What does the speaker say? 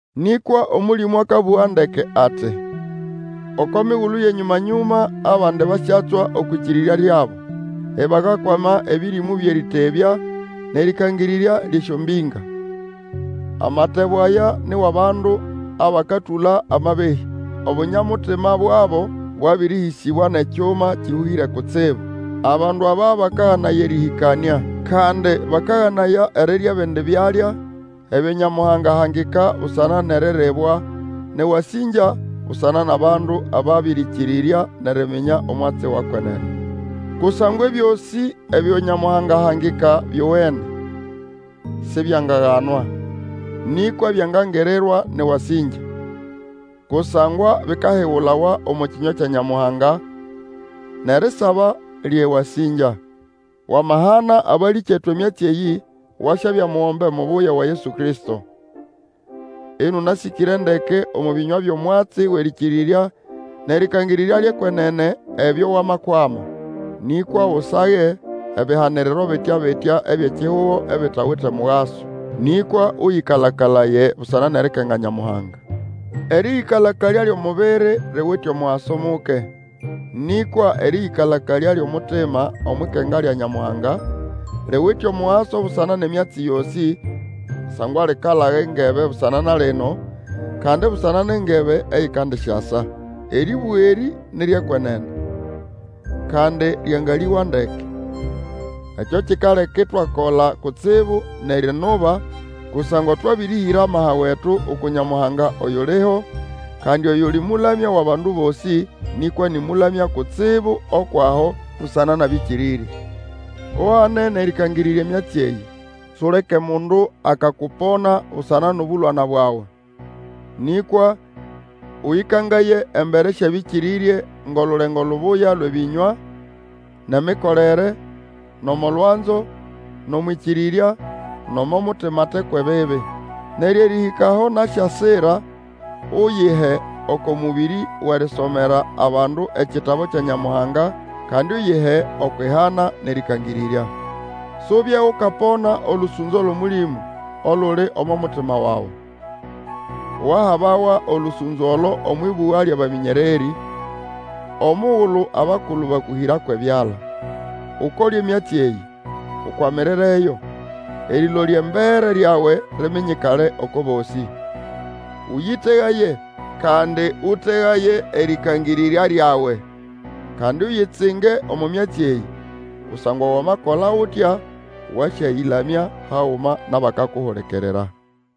Nĩkwa Omũlĩmũ akabũga ndeke ati, Oko migulu yʼenyũma-nyũma abandi basyatswa okwʼĩkĩrĩrya lyabo, ibakakwama ebĩrĩmũ byʼerĩtebya nʼerĩkangĩrĩrya lyʼesyombĩnga. Amatebo aya ni wʼabandu abakatũla amabehĩ. Obunya-mutima bwabo bwabĩrĩhĩsĩbwa nʼekyuma kĩhũhĩre kutsibu. Abandu aba bakaganaya erĩhĩkanĩa, kandi bakaganaya erirya ebindi byalya, ebyo Nyamuhanga ahangika busana nʼeriribwa nʼewasĩngya busana nʼabandu ababĩrĩkĩrĩrya nʼeriminya omwatsi wa kwenene. Kusangwa ebyosĩ ebyo Nyamuhanga ahangika byowene, sibyangaganwa. Nĩkwa byangangirirwa nʼewasĩngya. Kusangwa bikahigulawa omo kĩnywa kya Nyamuhanga, nʼerisaba lyʼewasĩngya. Wamahana abalĩkyetu emyatsi eyĩ, wasyabya mugombe mubuya wa Yesu Kristo, mũnasĩkĩre ndeke omo bĩnywa byʼomwatsi wʼerĩkĩrĩrya nʼerĩkangĩrĩrya lyʼekwenene ebyo Wamakwama. Nĩkwa Usage ebihaniriro bitya-bitya ebyʼekihugo ebitawite mugaso. Nĩkwa ũyĩkalakalaye busana nʼerikenga Nyamuhanga. Erĩyĩkala-kalya lyʼomubiri liwite omugaso muke, nĩkwa erĩyĩkala-kalya lyʼomutima omwʼikenga lya Nyamuhanga, liwite omugaso busana nʼemyatsi yosĩ, kusangwa likalaga engebe busana na lino, kandi busana nʼengebe eyikandisyasa. Erĩbũga erĩ ni ryʼekwenene, kandi ryangalĩgwa ndeke. Ekyo kikaleka itwakola kutsibu nʼerinuba, kusangwa twabĩrĩhĩra amaha wetu uku Nyamuhanga oyuliho, kandi oyuli Mũlamya wʼabandu bosĩ, nĩkwa nĩ Mũlamya kutsibu ukwʼaho busana nʼabĩkĩrĩrye. Uhane nʼerĩkangĩrĩrya emyatsi eyĩ. Suleke mundu akakupona busana nʼobũlwana bwawe, nĩkwa ũyĩkangaye embere syʼabĩkĩrĩrye ngʼolulengo lubuya lwʼebĩnywa, nʼemikolere, nʼomo lwanzo, nʼomwʼĩkĩrĩrya, nʼomo mutima ate kwʼebibi. Neryo erĩhĩka aho nasyasira, Uyihe oko mũbĩrĩ wʼerisomera abandu ekitabu kya Nyamuhanga, kandi Uyihe Okwʼihana, nʼerĩkangĩrĩrya. Subye ukapona olũsũnzo lwʼOmũlĩmũ, oluli omo mutima wawe. Wahabawa olũsũnzo olo omwʼĩbũga lyʼabamĩnyererĩ, omugulu abakulu bakũhĩra kwʼebyala. Ukole emyatsi eyĩ, ukwamirireyo, erĩlolya embere ryawe liminyikale oko bosĩ. Ũyĩtegaye, kandi ũtegaye erĩkangĩrĩrya lyawe. Kandi uyitsinge omo myatsi eyĩ, kusangwa Wamakola utya wasyayĩlamya haguma nʼabakakuhulikirira.